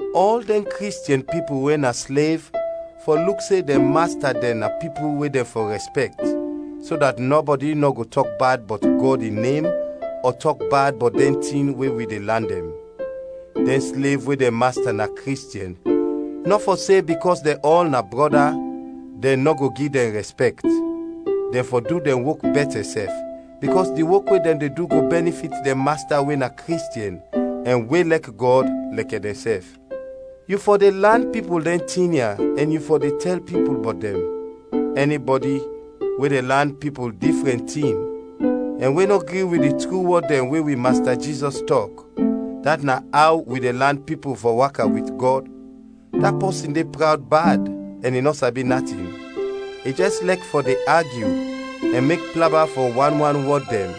Ɔl dɛn Kristiɛn pipul we na slev fɔ luk se dɛn masta dɛn na pipul we dɛn fɔ rɛspɛkt, so dat nɔbɔdi nɔ go tɔk bad bɔt Gɔd in nem ɔ tɔk bad bɔt dɛn tin we wi de lan dɛn. Dɛn slev we dɛn masta na Kristiɛn nɔ fɔ se bikɔs dɛn ɔl na brɔda, dɛn nɔ go gi dɛn rɛspɛkt. Dɛn fɔ du dɛn wok bɛtɛ sɛf, bikɔs di wok we dɛn de du go bɛnifit dɛn masta we na Kristiɛn ɛn we lɛk Gɔd, lɛkɛ dɛnsɛf. Yu fɔ de lan pipul dɛn tin ya ɛn yu fɔ de tɛl pipul bɔt dɛn. Ɛnibɔdi we de lan pipul difrɛn tin ɛn we nɔ gri wit di tru wɔd dɛn we wi Masta Jizɔs tɔk, dat na aw wi de lan pipul fɔ waka wit Gɔd, da pɔsin de prawd bad ɛn i nɔ sabi natin; i jɛs lɛk fɔ de agyu ɛn mek plaba fɔ wan wan wɔd dɛn,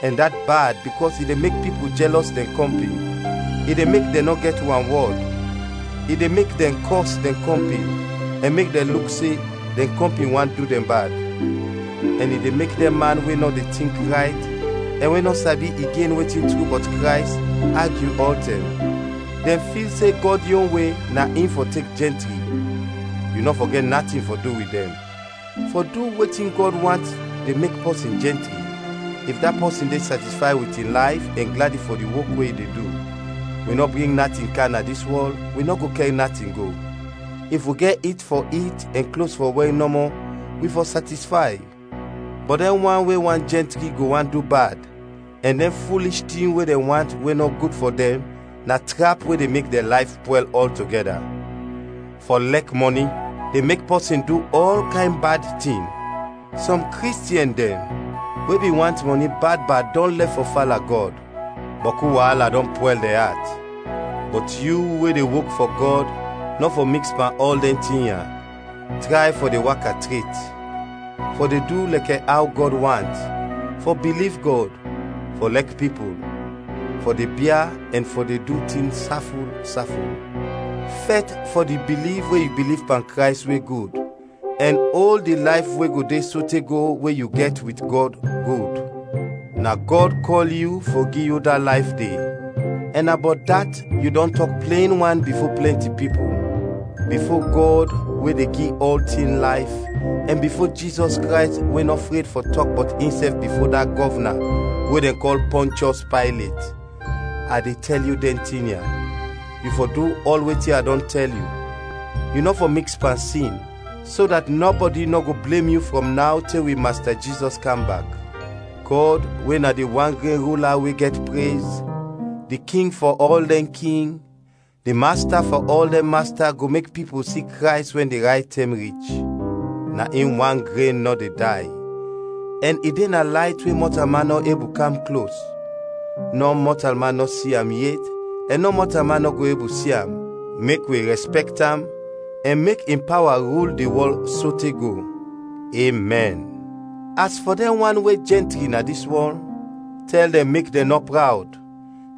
ɛn dat bad bikɔs i de mek pipul jɛlɔs dɛn kɔmpin, i de mek dɛn nɔ gɛt wanwɔd, i de mek dɛn kɔs dɛn kɔmpin ɛn mek dɛn luk se dɛn kɔmpin want du dɛn bad; ɛn i de mek dɛn man we nɔ de tink rayt ɛn we nɔ sabi igen wetin tru bɔt Krays, agyu ɔltɛm. Dɛn fil se Gɔd yon we na in fɔ tek jɛntri. Yu nɔ fɔ gɛt natin fɔ du wit dɛn. Fɔ du wetin Gɔd want de mek pɔsin jɛntri, if da pɔsin de satisfay wit in layf ɛn gladi fɔ di wok we i de du. Wi nɔ bring natin kam na dis wɔl, wi nɔ go kɛr natin go. If wi gɛt it fɔ it ɛn klos fɔ wɛr nɔmɔ, wi fɔ satisfay. Bɔt dɛn wan we want jɛntri go want du bad, ɛn dɛn fulish tin we dɛn want we nɔ gud fɔ dɛn, na trap we de mek dɛn layf pwɛl ɔltogɛda. Fɔ lɛk mɔni de mek pɔsin du ɔl kayn bad tin. Sɔm Kristiɛn dɛn we bin want mɔni bad bad dɔn lɛf fɔ fala Gɔd, bɔku waala dɔn pwɛl dɛn at. Bɔt yu we de wok fɔ Gɔd nɔ fɔ miks pan ɔl dɛn tin ya. Tray fɔ de waka tret, fɔ de du lɛkɛ aw Gɔd want, fɔ biliv Gɔd, fɔ lɛk pipul, fɔ de bia ɛn fɔ de du tin saful, saful. Fɛt fɔ di biliv we yu biliv pan Krays we gud, ɛn ol di layf we go de sote go we yu gɛt wit Gɔd, gud; na Gɔd kɔl yu fɔ gi yu da layf de ɛn na bɔt dat yu dɔn tɔk plen wan bifo plɛnti pipul. Bifo Gɔd we de gi ɔltin layf, ɛn bifo Jizɔs Krays we nɔ fred fɔ tɔk bɔt insɛf bifo da gɔvna we dɛn kɔl Pɔnchɔs Paylet, a de tɛl yu dɛn tin ya: Yu fɔ du ɔl wetin a dɔn tɛl yu, yu nɔ fɔ miks pan sin, so dat nɔbɔdi nɔ go blem yu frɔm naw te wi Masta Jizɔs kam bak. Gɔd we na di wan gren Rula we gɛt prez, di King fɔ ɔl dɛn king, di Masta fɔ ɔl dɛn masta go mek pipul si Krays wɛn di rayt tɛm rich. Na in wan gren nɔ de day, ɛn i de na layt we mɔtalman nɔ ebul kam klos, nɔ mɔtalman nɔ si am yet ɛn nɔ mɔtalman nɔ ebul si am. Mek wi rɛspɛkt am ɛn mek in pawa rul di wɔl sote go! Emɛn. As fɔ dɛn wan we jɛntri na dis wɔl, tɛl dɛn mek dɛn nɔ prawd,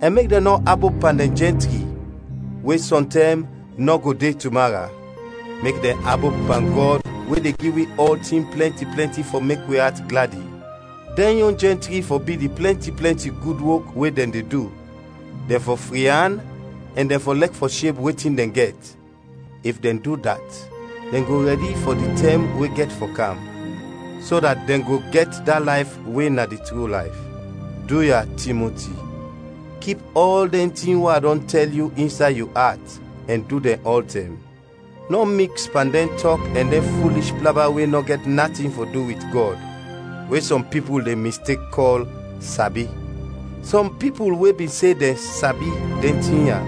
ɛn mek dɛn nɔ abop pan dɛn jɛntri, we sɔntɛm nɔ go de tumara; mek dɛn abop pan Gɔd we de gi wi ɔltin plɛnti plɛnti fɔ mek wi at gladi. Dɛn yon jɛntri fɔ bi di plɛnti plɛnti gud wok we dɛn de du, dɛn fɔ fri an ɛn dɛn fɔ lɛk fɔ sheb wetin dɛn gɛt. If dɛn du dat dɛn go rɛdi fɔ di tɛm we gɛt fɔ kam, so dat dɛn go gɛt da layf we na di tru layf. Duya, Timoti, kip ɔl dɛn tin we a dɔn tɛl yu insay yu at ɛn du dɛn ɔltɛm. Nɔ miks pan dɛn tɔk ɛn dɛn fulish plaba we nɔ gɛt natin fɔ du wit Gɔd, we sɔm pipul de mistek kɔl “sabi”. Sɔm pipul we bin se dɛn “sabi” dɛn tin ya,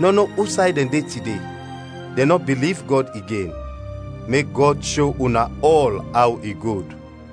nɔ no usay dɛn de tide, dɛn nɔ biliv Gɔd igen. Mek Gɔd sho una ɔl aw i gud.